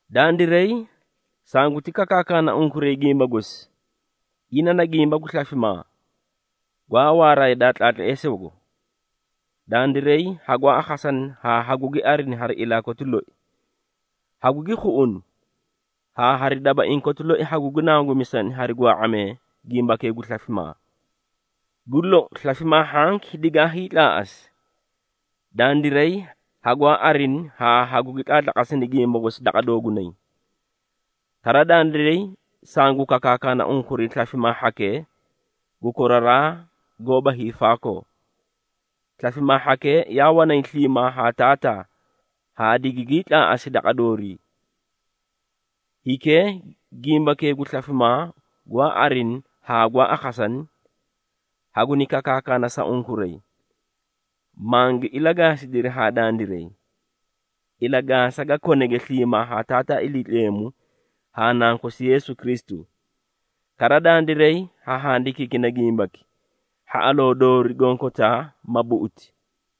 Dandiray sanguti kakaakana unkuray gimba gosi, ina na gimba gu slafimaa, gwaa waara yadaa tlaatleesoogo. Dandiray hagwaa akhasani haa gugi arini hari ilaa koti loi. Hagugi khuꞌuni, haa hari dabaiĩ koti loi hagugi nangumisani hari gwaa⁄amee gimbakee gu slafimaa. Gu lou, slafimaa hhanki digaa hiitlaaꞌasi, dandiray hagwaa arini haa hagu ilatlatlaatlayna gimba gosi daqa doogunay. Kara, dandiray sangu kakaakana unkuray slafimaa hhakee gu koraraa haa koraraa goóba hiifaakoo. Slafimaa hhakee yaa wanay sliimaa haa Taataa haa digigii tlaaꞌasi daqa doorii. Hikee gimbakee gu slafimaa gwaa arini haa gwaa akhasani, haguni kakaakana sa unkuray, mangi ilagaasidiri haa dandiray, ilagaasa ga konege sliimaa haa Taataa Iliitleemu haa Nankosi Yeesu Kristu. Kara, dandiray ha handikiikina gimbaki, hhaꞌaloo doori gonkotaa ma buꞌuti.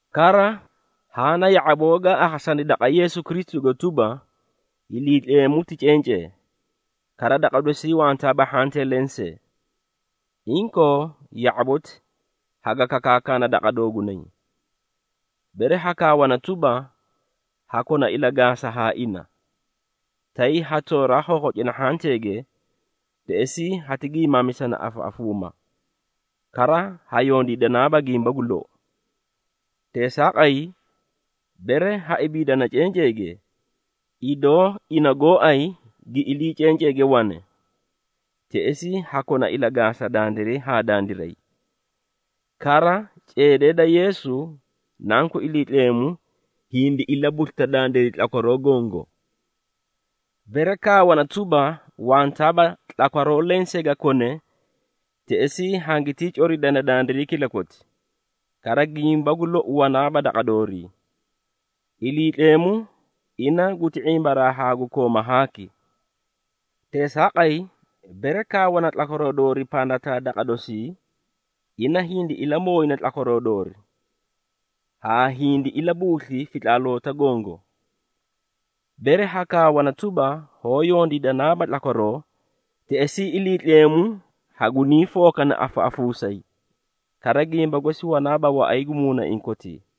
Kara, haã na ya⁄aboo gaa akhasani daqa Yeesu Kristugo tuba, Iliitleemu ti cencee, kara daqa dosii wantaaba hhantee lensee. Inkoo ya⁄aboti haga kakaakana daqa doogunay. Bere hakaawana tuba, ha kona ilagaasa haa ina, tay ha tooraa khokhocina hhanteege, teꞌesii hati giimaamisana afaꞌafuuma, kara ha yondiidanaaba gimba gu lou. Teesaaqay, bere ha ibiidana cenceege, idoo ina gooay gi ilii cenceege wane, teꞌesii ha kona ilagaasa dandiray haa dandiray. Kara, ceedee da Yeesu, Nanku Iliitleemu hindi ilabuslita dandiray tlakwaroo gongo. Bere kaawana tuba, wantaaba tlakwaroo lensee ga kone, teꞌesii hangitii coridana dandiray kilakoti, kara gimba gu lou wanaaba daqa doorii. Iliitleemu, ina guti ⁄imbaraa haa gu kooma haaki. Teesaaqay, bere kaawana tlakwaroo doori pandataa daqa dosii, ina hindi ilamooyina tlakwaroo doori haa hindi ilabuusli fitlaaloota gongo. Bere hakaawana tuba, hoó yondiidanaaba tlakwaroo, teꞌesii Iliitleemu hagunii fookana afaꞌafuusayi, kara gimba gosi wanaaba waꞌay gu muunaiĩ kotii.